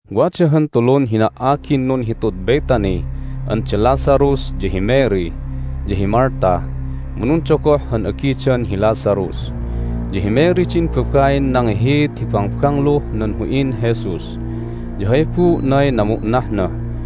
Wada han tulun hina"agin nunhitud Bethany an da Lazarus ya hi Mary, ya hi Martha. Mu nundogoh han agidan hi Lazarus. Ya hi Mary din babain nangihiit hi bangbangluh nan hu'in Jesus, ya hay buu'nay namu'nahna.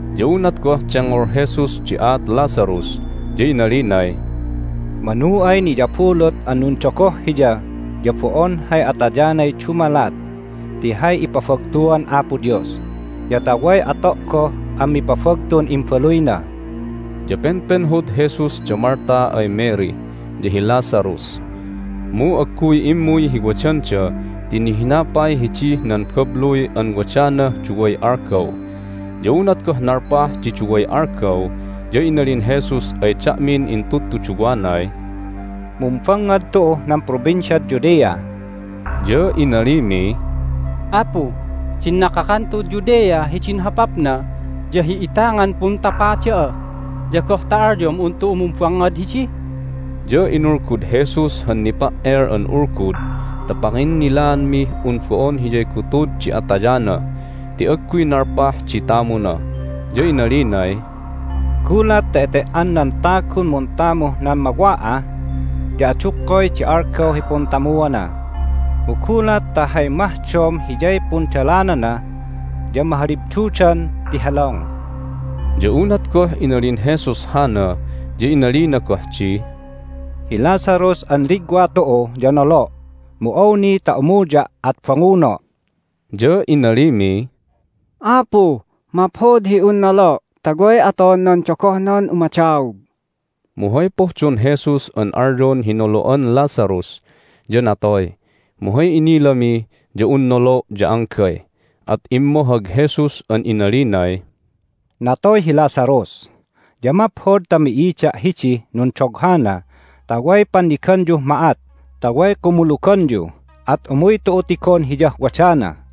Ya unat goh dengngol Jesus di aat Lazarus ya inalinay, "Manu ay niyabulut an nundogoh hiya ya bo'on hay atayanay dumalat ti hay ipabagtuan Apo Dios, ya ta way ato' goh an mipabagtun Imbaluyna." Ya penpenhod Jesus da Martha ay Mary, ya hi Lazarus. Mu agguy immuy hi wadanda ti nihina pay hidih nan babluy an wadanah duway algaw. Ya unat goh nalpah di duway algaw ya inalin Jesus ay da'min intudtuduwanay, "Mumbangngad tu'uh nan Provinciad Judea." Ya inalimiy, "Apu, din nakakan tu'ud Judea hidin hopapna ya hi'itangan puntapa da'a, ya goh ta alyom un tu'u mumbangngad hidi?" Ya inulgud Jesus han nipa"el an ulgud ta panginnilaanmih un bo'on hiyay gutud di atayana ti agguy nalpah di tamuna, ya inalinay, "Gulat ta ete"an nan tagun muntamuh nan mawa'ah ya adukkoy di algaw hi puntamuana. Mu gulat ta hay mahdom hiyay pundalanana ya mahalibdudan ti helong." Ya unat goh inalin Jesus hana ya inalina goh di, "Hi Lazarus an ligwa tu'u ya nolo', mu awni ta umuya' at banguno'." Ya inalimiy, "Apu, maphod hi un nolo' ta way aton nan dogohnan umadaog." Mu hay pohdon Jesus an alyon hi nolo'an Lazarus ya natoy, mu hay inilami ya un nolo' ya anggay. At immohag Jesus an inalinay, "Natoy hi Lazarus, ya maphod ta mi'ida' hidih nundoghana ta way panniganyuh ma'at ta way kumuluganyu. At umuy tu'u tigon hiyah wadana."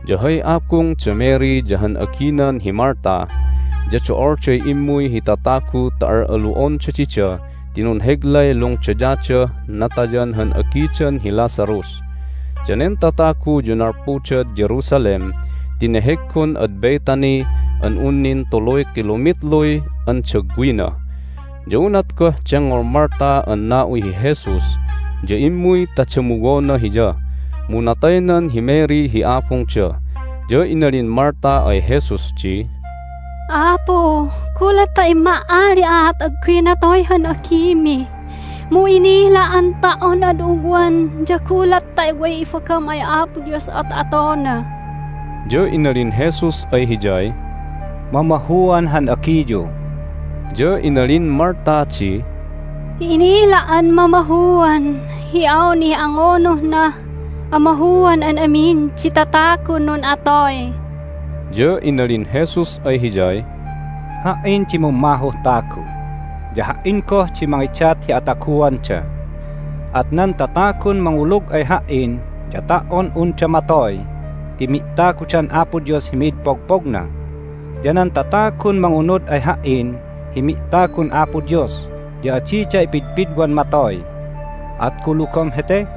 Ya hay abung da Mary ya han aginan hi Martha ya do'olday immuy hi tatagu ta al'alu'onda dida ti nunheglay lungdayadah natayan han agidan hi Lazarus. Danen tatagu ya nalpudad Jerusalem ti neheggon ad Bethany an un nin tuluy kilomitluy andagwina. Ya unat goh dengngol Martha an na'uy hi Jesus ya immuy ta damuwona Hiya. Mu nataynan hi Mary hi abungda. Ya inalin Martha ay Jesus di, "Apu, gulat ta imma"ali'aat agguy natoy han agimi! Mu inila' an ta"on ad ugwan ya gulat ta way ibagam ay Apo Dios at atona." Ya inalin Jesus ay hiyay, "Mamahuan han agiyu." Ya inalin Martha di, "Inila' an mamahuan hi awnih angunuhnah amahuan an amin di tatagun nun'atoy." Ya inalin Jesus ay hiyay, "Ha"in di mummahuh tagu, ya Ha"in goh di mangidat hi ataguanda. At nan tatagun mangulug ay Ha"in ya ta"on unda matoy ti mi'tagudan Apo Dios hi mid pogpogna. Ya nan tatagun mangunud ay Ha"in hi mi'tagun Apo Dios ya adida ipidpidwan matoy. At kulugom hete?"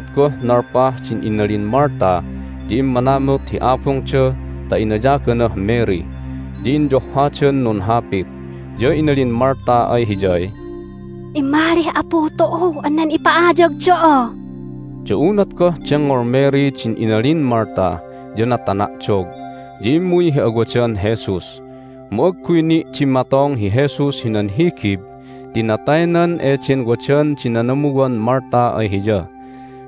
Unat goh nalpah din inalin Martha ya immanamut hi abungda ta inayaganah Mary. Ya inyohhadan nunhapit, ya inalin Martha ay hiyay, "Immalih Apu tu'u an nen ipa'ayag da'a." Ya unat goh dengngol Mary din inalin Martha ya natana'dog, ya immuy hi awadan Jesus. Mu agguy ni' dimmatong hi Jesus hinan higib ti nataynan eden wadan di nanamuwan Martha ay Hiya.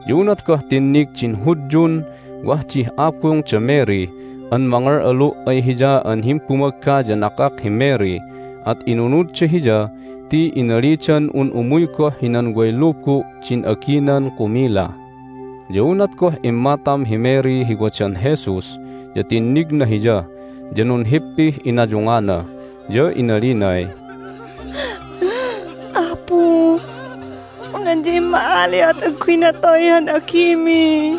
Ya unat goh tinnig din Hudyun wah dih abung da Mary an mangal'alu' ay hiya an himbumagga ya nakak hi Mary at inunudda hiya ti inalidan un umuy goh hinan way lubu' din aginan kumila. Ya unat goh immatam hi Mary hi wadan Jesus ya tinnigna Hiya, ya nunhippih inayungana, ya inalinay, "Apu, un adya imma"ali'a at agguy natoy han agimi!"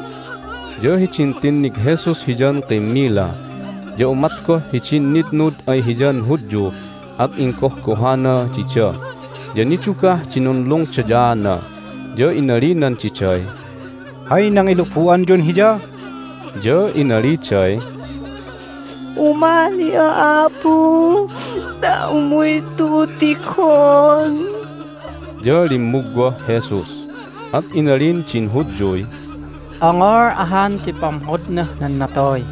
Ya hidin tinnig Jesus hiyan kimmila ya umat goh hidin nitnud ay hiyan Hudyu at inggohgohana dida, ya nidugah di nunlungdayaana. Ya inalinan diday, "Hay nangilubu'anyun hiya?" Ya inaliday, "Umali'a, Apu, ta umuy tu'u tigon." Ya limmugwah Jesus. At inalin din Hudyuy, "Ongol ahan di pamhodnah nan natoy!"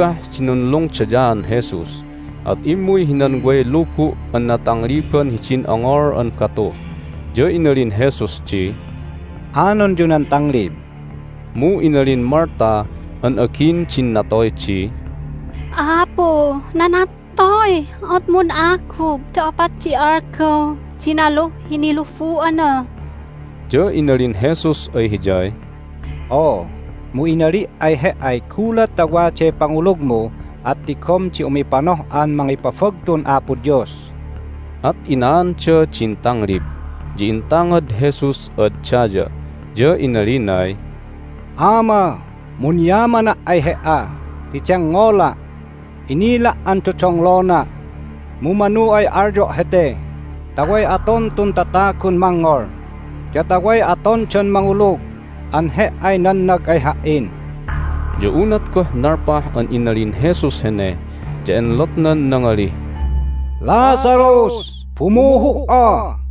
Nidugah di nunlungdayaan Jesus, at immuy hinan way lubu' an natangliban hidin ongol an batu. Ya inalin Jesus di, "Anonyu nan tanglib!" Mu inalin Martha an agin din natoy di, "Apu, nanattoy! At mun'agub ti opat di algaw di naluh hi nilubu'ana!" Ya inalin Jesus ay hiyay, "Oo, mu inali' ay he"ay gulat ta waday pangulugmu at tigom di umipanoh'an mangipabagtun Apo Dios." At inaanda din tanglib. Ya intangad Jesus ad daya, ya inalinay, "Ama, munyamana' ay He"a ti dengngola'. Inila' an dodonglona', mu manu ay alyo' hete ta way aton tun tatagun mangngol, ya ta way atondan mangulug an He"ay nannag ay Ha"in." Ya unat goh nalpah an inalin Jesus hene ya enlotnan nangalih, "Lazarus! Bumuhu"a!"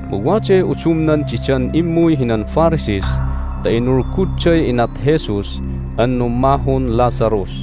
Mu waday udumnan didan immuy hinan Pharisees ta inulgudday inat Jesus an nummahun Lazarus.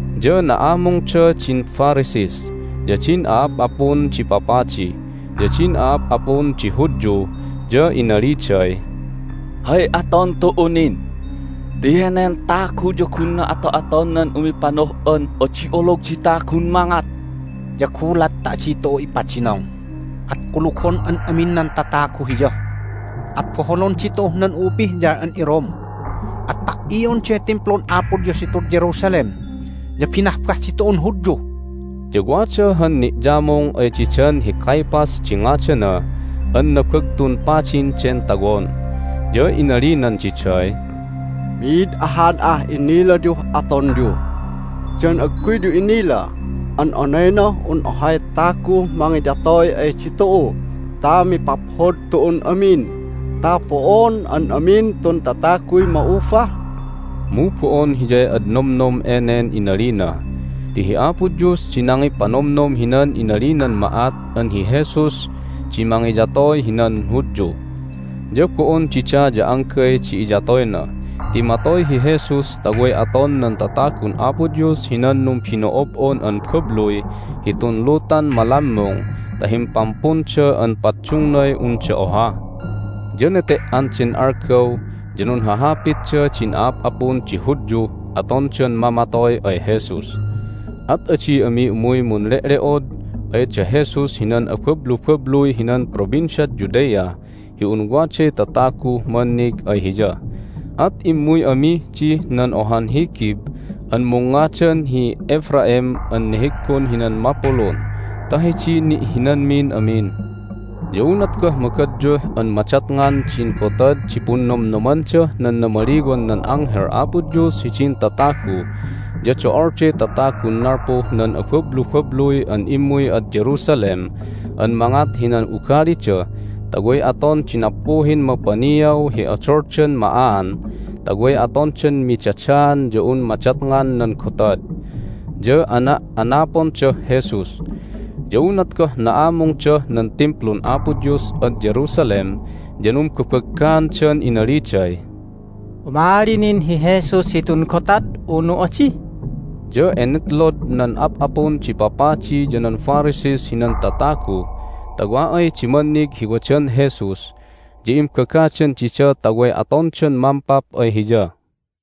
Ya na'amungda din Pharisees, ya din a'ap'apun di papadi, ya din a'ap'apun di Hudyu ya inaliday, "Hay aton tu'u nin? Ti henen tagu ya gunna ato'aton nan umipanoh'an adi olog di tagun mangat! Ya gulat ta adi tu'u ipadinong at kulugon an amin nan tatagu Hiya, at boholon ditu'uh nan u'upihyal an iRome, at pa"ionday Timplun Apo Dios hitud Jerusalem, ya binahbah ditu'un Hudyu!" Ya wada han ni'yamung ay didan hi Caiaphas di ngadana an Nabagtun Padin den tawon, ya inalinan diday, "Mi'id ahan ah inilayuh atonyu! Dan agguyyu inila an onaynah un ohay taguh mangiyatoy ay ditu'u ta mipaphod tu'un amin ta bo'on an amin tun tataguy ma'ubah?" Mu bo'on hiyay ad nomnom enen inalina, ti hi Apo Dios di nangipanomnom hinan inalinan ma'at an hi Jesus di mangiyatoy hinan Hudyu. Ya bo'on dida ya anggay di iyatoyna, ti matoy hi Jesus ta way aton nan tatagun Apo Dios hinan numbino'ob'on an babluy hitun lutan malammung ta himpampunda an paddungnay unda oha. Ya nete"an den algaw ya nunhahapitda din a'ap'apun di Hudyuh atondan mamatoy ay Jesus. At adi ami umuy munle'le'od ay da Jesus hinan abablubabluy hinan Provinciad Judea hi un waday tataguh mannig ay Hiya, at immuy amih dih nan ohan higib an mungngadan hi Ephraim an neheggon hinan mapulun ta hidiy ni'hinanmin amin. Ya unat goh magadyuh an madatngan din Gotad di Punnomnomandah nan Namaliwan nan Anghel Apo Dios hidin Tatagu ya do'olday tatagun nalpuh nan abablubabluy an immuy ad Jerusalem an mangat hinan ugalida ta way aton di nappuhin mapaniaw hi odoldan ma'aan ta way atondan midadaan ya un madatngan nan gotad. Ya ana'anapondah Jesus. Ya unat goh na'amungdah nan Timplun Apo Dios ad Jerusalem ya numbabaggaandan inaliday, "Umali nin hi Jesus hitun gotad, unu adi?" Ya enetlod nan ap'apun di papadi ya nan Pharisees hinan tatagu ta wa ay di mannig hi wadan Jesus ya imbagadan dida ta way atondan mampap ay Hiya.